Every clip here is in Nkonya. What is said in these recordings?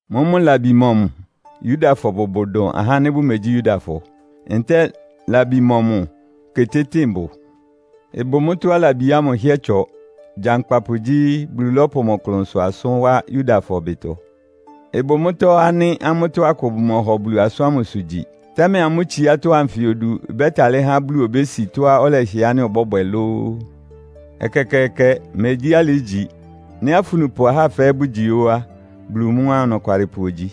Mʋ́mʋ́ labi mɔmʋ Yudafɔ bʋbʋ dʋn ahá ánɩ́ bʋmegyí Yudafɔ? Ntɛ́ɛ labi mɔmʋ ketétɩ́ɩn bʋ? Ɩbʋ mʋ́tɔ́á labi ámʋ ɩhɩ́ɛ́ ɩtsɔ! Gyankpapʋ gyí, Bulu lɔ́pʋ mʋ klʋnsʋ asʋ́n wá Yudafɔ ɩbɩtɔ. Ɩbʋ mʋ́tɔ́ ánɩ́ amʋ́tɔ́ akʋ bʋmɔhɔ Bulu asʋ́n ámʋsʋ gyi. Támɛ amʋ́ tsiátɔ́ anfɩ odu ɩbɛ́talɩ́ há Bulu obési tɔ́á ɔlɛhɩɛ ánɩ́ ɔbɔ́bwɛ lóó? Ɛkɛkɛɛkɛ! Megyí alɩ ígyi! Nɩ́ afunupʋ ahá fɛ́ɛ́ bʋgyi óó á, Bulu mʋ́ á, ɔnɔkwalɩpʋ ogyi.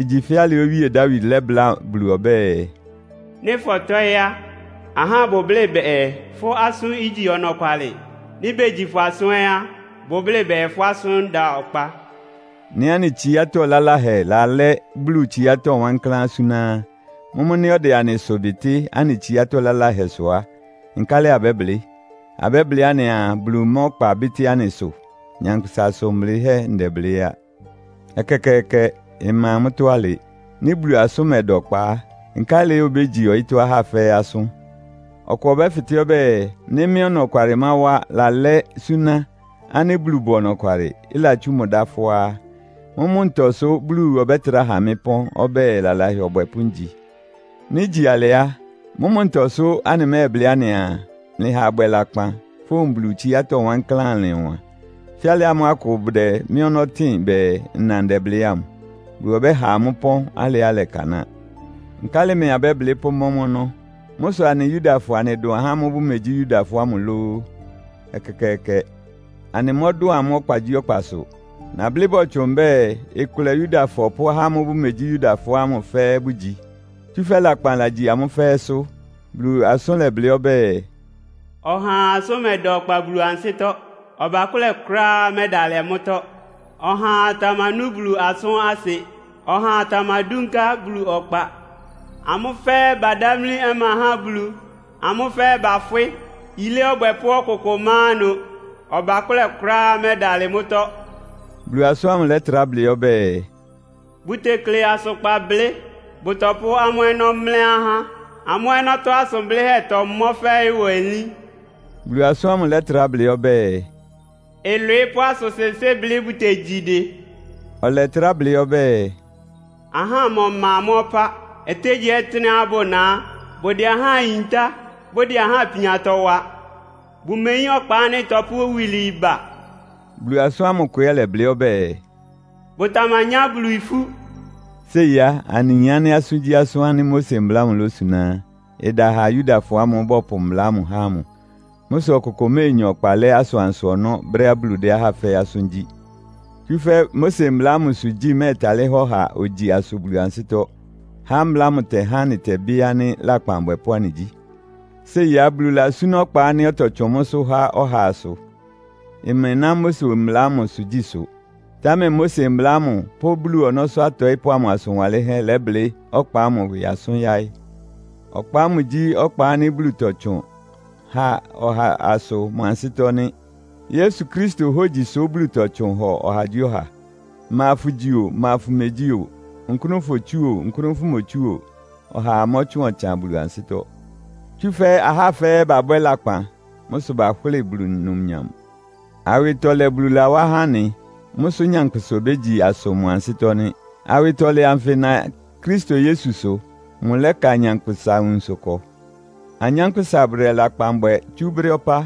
Igyi fɛ́ alɩá Owíe Dawid lɛ́bláa Bulu ɔbɛ́ɛ, “Nɩ́ fɔtɔ́ɩ́ á, ahá bʋblɩ́ bɛɛ fʋ́ asʋ́n igyi ɔnɔkwalɩ. Nɩ́ begyi fʋ́ asʋ́n ɛ́ á, bʋblɩ́ bɛɛ fʋ́ asʋ́n da ɔkpa.” Nɩ́ anɩ tsiátɔ́ laláhɛ lalɛ́ Bulu tsiátɔ́ wankláán súná á, mʋ́mʋ́ nɩ́ ɔdɛ anɩ ɩsʋ bɩtɩ́ anɩ tsiátɔ́ laláhɛ sʋ á, nkálɩ abɛ́blɩ́? Abɛ́blɩ́ anɩaa, Bulu má ɔkpa bɩ́tɩ́ anɩ ɩsʋ? (Nyankpʋsa asʋn blɩ́hɛ́ ndɛblɩ́ á.) Ɛkɛkɛɛkɛ! Ɩma mʋ́tɔ́ alɩ. Nɩ́ Bulu asʋ́n mɛda ɔkpa á, nkálɩ obégyi ɔyɩ́tɔ́ ahá fɛ́ɛ́ asʋ́n? Ɔkʋ ɔbɛ́fɩtɛ́ ɔbɛ́ɛ, nɩ́ mɩ́ ɔnɔkwalɩmáwá lalɛ́ súná ánɩ́ Bulu bʋ ɔnɔkwalɩ, ɩlatsú mʋ dá fʋ́á á, mʋ́mʋ́ ntɔ sʋ́ Bulu ɔbɛ́trá ha mɩ́ pɔ́n ɔbɛ́ɛ lalahɛ ɔbwɛpʋ́ ngyi? Nɩ́ igyi alɩ á, mʋ́mʋ́ ntɔ sʋ́ anɩmɛ́ɛblɩ́ anɩaa, “Mlɩha abwɛ lakpan, fówun Bulu tsiátɔ́ wankláán ɩlɩn ɔwan?” Fɛ́ alɩ ámʋ́ʋ́ akʋ bʋdɛ mɩ́ ɔnɔ́ tɩn bɛɛ, nna ndɛblɩ́ ámʋ. Bulu ɔbɛ́ha amʋ́ ɩpɔ́n alɩá ɩlɛkanáa. Nkálɩ mɛɛ abɛ́blɩ́ pʋ́mɔ́ mʋ́ ɔnɔ́? Mʋ́ sʋ anɩ Yudafɔ anɩdʋn ahá ámʋ́ʋ́ bʋmegyí Yudafɔ ámʋ lóó? Ɛkɛkɛɛkɛ! Anɩmɔ́dʋn amʋ́ ɔkpagyíɔkpasʋ. Nablɩ́ bɔtsʋn mbɛ́ɛ, ɩkʋlɛ Yudafɔ pʋ́ ahá ámʋ́ʋ́ bʋmegyí Yudafɔ ámʋ fɛ́ɛ́ bʋgyi. Tsúfɛ́ lakpan lagyi amʋ́ fɛ́ɛ́sʋ́. Bulu asʋ́n lɛblɩ́ ɔbɛ́ɛ, “Ɔhaa asʋ́n mɛda ɔkpa Bulu ansɩ́tɔ́. Ɔbakʋ́lɛ kʋ́ráá mɛ́dalɩ mʋ́tɔ́. Ɔhaa tamanú Bulu asʋ́n asɩ; ɔhaa tamadúnká Bulu ɔkpa. Amʋ́ fɛ́ɛ́ badámlí ɔma há Bulu, ámʋ́ fɛ́ɛ́ bafwɩ́. Yilé ɔbwɛpʋ́ ɔkʋkʋ má ɩnʋ. Ɔbakʋ́lɛ kʋ́ráá mɛ́dalɩ mʋ́tɔ́.” Bulu asʋ́n ámʋ lɛ́trá blɩ́ ɔbɛ́ɛ, “Bʋtekle asʋkpan blɩ́. Bʋtɔpʋ́ amʋ́ ɔnɔ́ mlɛ́ ahá. Amʋ́ ɔnɔ́tɔ́ asʋn blɩ́hɛ́ tɔmɔ́ fɛ́ ɩwɔ elín.” Bulu asʋ́n ámʋ lɛ́trá blɩ́ ɔbɛ́ɛ, “Ɩlwɩɩ́ pʋ́ asʋn-sɩnsɩ́n blɩ́ bʋtegyi dɩ.” Ɔlɛtrá blɩ́ ɔbɛ́ɛ, “Ahámɔ ma amʋ́ ɔpá. Ɔtɩ́nɛgyíɔtɩ́nɛ́á bʋna á, bʋdɛ ahá yintá, bʋdɛ ahá ipiantɔ wa. Bʋmeyín ɔkpa ánɩ́ ɩtɔpʋ́ iwilwii ba.” Bulu asʋ́n ámʋ kʋ ɛ́ lɛblɩ́ ɔbɛ́ɛ, “Bʋtamanyá Bulu ifú.” Séi á, anɩyin ánɩ́ asʋ́ngyíasʋ́n ánɩ́ Mose Mbla ámʋ losuná á, ɩda ha Yudafɔ ámʋ́ʋ́ bɔpʋ mbla ámʋ há ámʋ. Mʋ́ sʋ ɔkʋkʋ méenya ɔkpa lɛ́ asʋansʋ ɔnɔ́ brɛ́á Bulu dɛ́ ahá fɛ́ɛ́ asʋ́n gyí. Tsúfɛ́ Mose Mbla ámʋsʋ gyí mɛ́ɛtalɩ́ há ɔha ogyi asʋ Bulu ansɩ́tɔ́. Há mbla ámʋ ɩtɛhá anɩtɛbɩ́ ánɩ́ lakpan abwɛpʋ́ anɩgyí. Séi á, Bulu lasúná ɔkpa ánɩ́ ɔtɔtsʋn mʋ́sʋ́ há ɔha asʋ. Ɩmɛná Mose Mbla ámʋsʋ gyísʋ. Támɛ Mose Mbla ámʋ pʋ́ Bulu ɔnɔ́sʋ́ atɔɩ́pʋ́ amʋ asʋn wanlɩ́nhɛ́ lɛ́blɩ́ ɔkpa ámʋ ɩwɩ asʋ́n yáɩ́. Ɔkpa ámʋ gyí ɔkpa ánɩ́ Bulu tɔtsʋn há ɔha asʋ mʋ ansɩ́tɔ́ nɩ́. Yesu Kristo hógyisʋ Bulu tɔtsʋn hɔ ɔhagyíɔha. Ma fʋgyi o, ma fʋmegyí o, nkʋ́nʋ fotsú o, nkʋ́nʋ fʋmotsú o, ɔhaa mɔ́tsʋn ɔtsan Bulu ansɩ́tɔ́. Tsúfɛ́ ahá fɛ́ɛ́ babwɛ́ lakpan. Mʋ́ sʋ bahʋ́lɩ Bulu numnyam. Awɩtɔlɛ Bulu lawá há anɩ. Mʋ́ sʋ́ nyankpʋsa obégyi asʋ mʋ ansɩ́tɔ́ nɩ́. Awɩtɔlɛ anfɩ ɩna Kristo Yesusʋ. Mʋlɛ́ka nyankpʋsa nwunsʋ ɩkɔ. Anyánkpʋ́sa bʋdɛ lakpan bwɛ tsú brɛ́ ɔpá,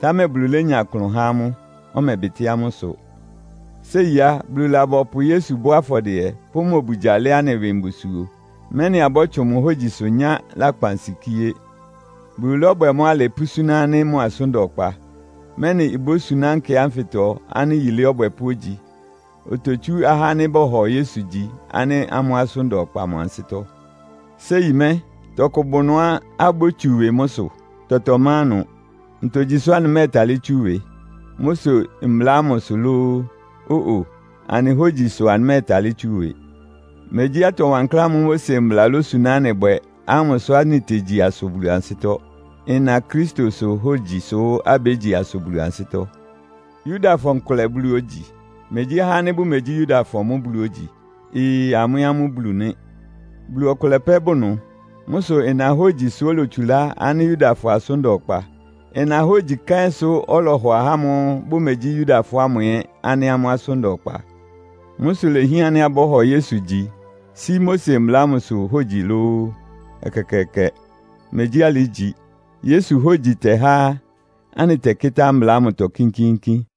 támɛ Bulu lénya klʋn há amʋ́, ɔmɛbɩtɩ́ amʋ́ ɩsʋ. Séi á, Bulu labɔpʋ Yesu bɔ́ afɔdɩɛ, pʋ́ mʋ obugya lɛ́ anɩ ɩwɩ mbusuo, mɛ́nɩ abɔ́tsʋn mʋ hógyisʋ nyá lakpansikíé. Bulu lɔ́bwɛ mʋ́ alɩ pʋ́súná ánɩ́ mʋ asʋ́n da ɔkpa, mɛ́nɩ ibósuná nkɛ ánfɩtɔ ánɩ́ yilé ɔbwɛpʋ́ ogyi. Ototsú ahá ánɩ́ bɔhɔ Yesu gyi ánɩ́ amʋ́ asʋ́n da ɔkpa mʋ ansɩ́tɔ́. Séi mɛ́, tɔkʋ bʋ ɩnʋá abótsu ɩwɩ mʋ́sʋ́? Tɔtɔ má ɩnʋ. Ntogyi sʋ́ anɩmɛ́ɛtalɩ́ tsú ɩwɩ? Mose Mbla ámʋ sʋ lóó? Ó-o! Anɩ hógyi sʋ anɩmɛ́ɛtalɩ́ tsú ɩwɩ. Megyí atɔ wankláán ámʋ́ʋ́ Mose Mbla losuná anɩ bwɛ ámʋ sʋ anɩtegyi asʋ Bulu ansɩ́tɔ́. Ɩna Kristosʋ hógyisʋ abégyi asʋ Bulu ansɩ́tɔ́. Yudafɔ nkʋlɛ Bulu ógyi? Megyí ahá ánɩ́ bʋmegyí Yudafɔ mʋ́ Bulu ogyi? Ee! Amʋ́ ɛ́ amʋ́ Bulu nɩ́. Bulu ɔkʋlɛ pɛ́ bʋ ɩnʋ. Mʋ́ sʋ ɩna hógyisʋ olotsulá ánɩ́ Yudafɔ asʋ́n da ɔkpa. Ɩna hógyi kɛ́nsʋ́ ɔlɔhɔ ahá ámʋ́ʋ́ bʋmegyí Yudafɔ ámʋ ɛ́ ánɩ́ amʋ́ asʋ́n da ɔkpa. Mʋ́ sʋ ilehián ánɩ́ abɔ́hɔ Yesu gyi, sí Mose Mbla ámʋsʋ hógyi lóó? Ɛkɛkɛɛkɛ! Megyí alɩ ígyi. Yesu hógyi tɛ́há anɩtɛkɩ́tá mbla ámʋtɔ kínkíínkín.